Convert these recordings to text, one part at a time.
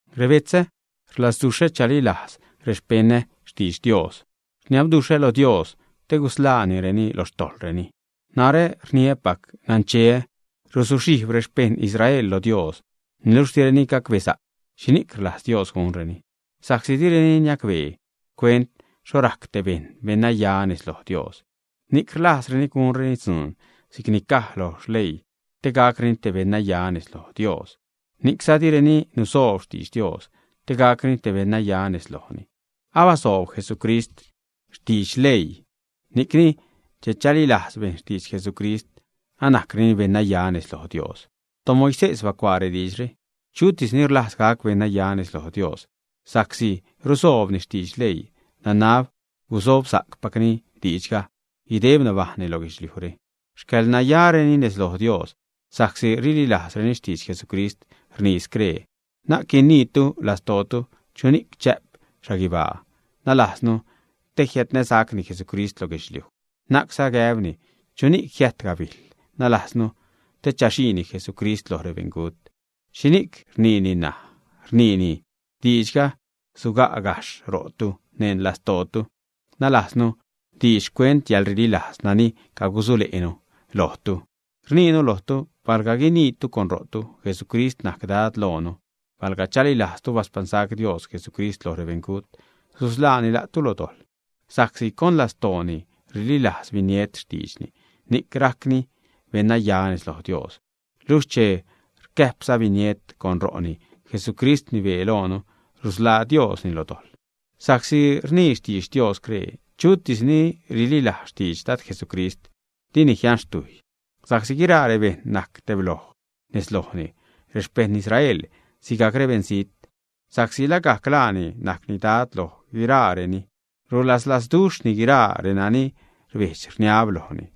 Rebetzä, rlazduxhä chalilajz rexpeṉä xtidx Dios. Rniabduxhä lo Dios te gusḻaanireni lo xtojḻreni. Narä rniäpac nancheä ruzuxhijb rexpeṉ Israel lo Dios, niluxh direni gumbesa'c xhini'c rlajz Dios gunreni. Sa'csi direni niacbee xcuent xho rajc te bejṉ te beṉnaya nez loj Dios, ni'c rlajzreni gunreni dzuun si'c ni caj lo leii te gacreni beṉnaya nez loj Dios, ni'cza direni nusoob xtidx Dios te gacreni beṉnaya nez lojni. Abasoob Jesucrist xtidx Leii, ni'cni che chalilajz bejṉ xtidx Jesucrist, anajcreni beṉnaya nez loj Dios. ToMoisés bacuaa rediidxre: “Chutis ni rlajz gac beṉnaya nez loj Dios sa'csi rusoobni xtidx leii, nanab gusobsa'cpacni diidxga guideb nabajṉni lo guedxliujre.” Xcäḻnayareni nez loj Dios sa'csi rililajzreni xtidx Jesucrist, rnii scree: “Na'c guiniitu neṉ lastootu, ¿chuni'c chä'p xhaguibaa?” nalajznu, te jiädnäsacni Jesucrist loj guedxliuj. Na'cza gäbni: “¿Chuni'c jiäjt gabijl?” (nalajznu te chaxiini Jesucrist loj rebeṉgut). ¿Xhini'c rniini ṉaj? Rniini: “Diidxga suga' gajxh ro'tu, neṉ lastootu.” Nalajznu, diidx xcuent yäḻrililaaz nani cagusule'nu lojtu. Rniinu lojtu, palga guiniitu con ro'tu, Jesucrist najc Dad loonu, palga chalilajztu baspaṉsac Dios Jesucrist loj rebeṉgut, susḻaani la'tu lo dojḻ. Sa'csi con lastooni rililajz biniet xtiidxni, ni'c rajcni beṉnaya nez loj Dios; luxh che rcäjpza biniet con ro'ni, Jesucrist rnibee loonu, rusḻaa Diosni lo dojḻ. Sa'csi rnii xtidx Dios scree: “Chutis ni rililajz xtidx Dad Jesucrist, dini jianxtujy.” Sa'csi guiraa rebejṉ najc tebloj nez lojni, rexpejṉ Israel sigajc rebeṉzijt, sa'csi lagajc laani najcni Dad lo guiraareni, rulaslazduxhni guiraa renani rbedx-rniab lojni.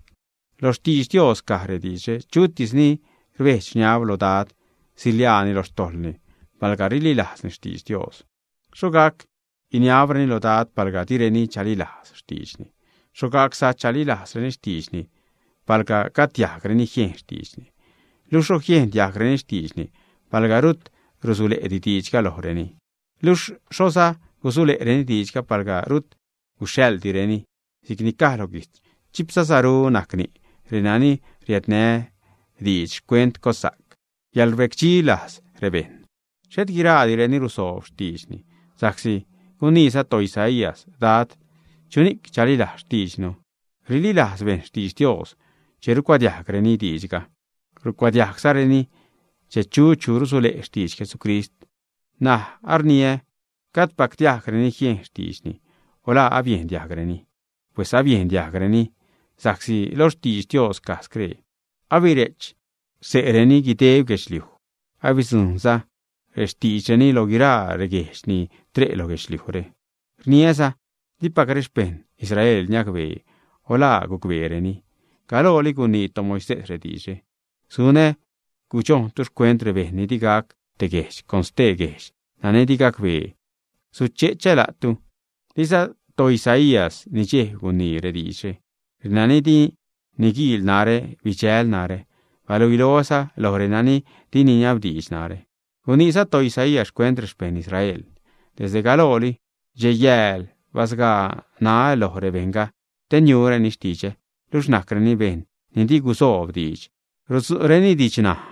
Lo xtidx Dios caj rediidxre: “Chutis ni rbedx-rniab lo Dad, siḻiaani lo xtojḻni palga rililajzni xtidx Dios.” ¿Xho gac guiniabreni lo Dad, palga direni chalilajz xtiidxni? ¿Xho gacza chalilajzreni xtiidxni, palga gajd diajgreni jiejn xtiidxni? ¿Luxh xho jiejn diajgreni xtiidxni palga rut rusule'di diidxga lojreni, ä? Luxh ¿xhoza gusule'reni diidxga palga rut guxhaḻdireni? Si'cni caj lo guijtz: “Chipza saru najc ni' renani riädnä diidx xcuent cossa'c, yälrbecdxi lajz rebejṉ.” Xhet guiraadireni rusoob xtiidxni, sa'csi guniiza toIsaías: “Dad, ¿chuni'c chalilajz xtiidxnu?” Rililajz bejṉ xtidx Dios che rucuadiajgreni diidxga; rucuadiajgzareni che yu' chu rusule' xtidx Jesucrist. N̲aj arniä: Gajdpac diajgreni jiejn xtiidxni, o ¿la babiejn diajgreni, ä? Pues abiejn diajgreni, sa'csi lo xtidx Dios caj scree: Abire'ch xse'reni guideb guedxliuj, abidzujṉza rextiidxreni lo guiraa reguejdx ni tre' lo guedxliujre. Rniäza: Dipac rexpeṉ Israel niacbee, o ¿la gucbeereni, ä? Galooli gunii toMoisés rediidxre: Sunä gudxojntu xcuent rebejṉ ni di gac te guejdx, con te guejdx nani di gacbee suche'chä la'tu. Diza toIsaías nidxejb guniini rediidxre: Renani di niguiil narä, bidxäjl narä, baluiloäza loj renani di niniabdiidx narä. Guniiza toIsaías xcuent rexpeṉ Israel: Desde galooli, dxej-yääl basgaä ṉaä lo rebejṉga te niureni xtidxä, luxh najcreni bejṉ ni di gusoob diidx, rutzu'reni didxnaj.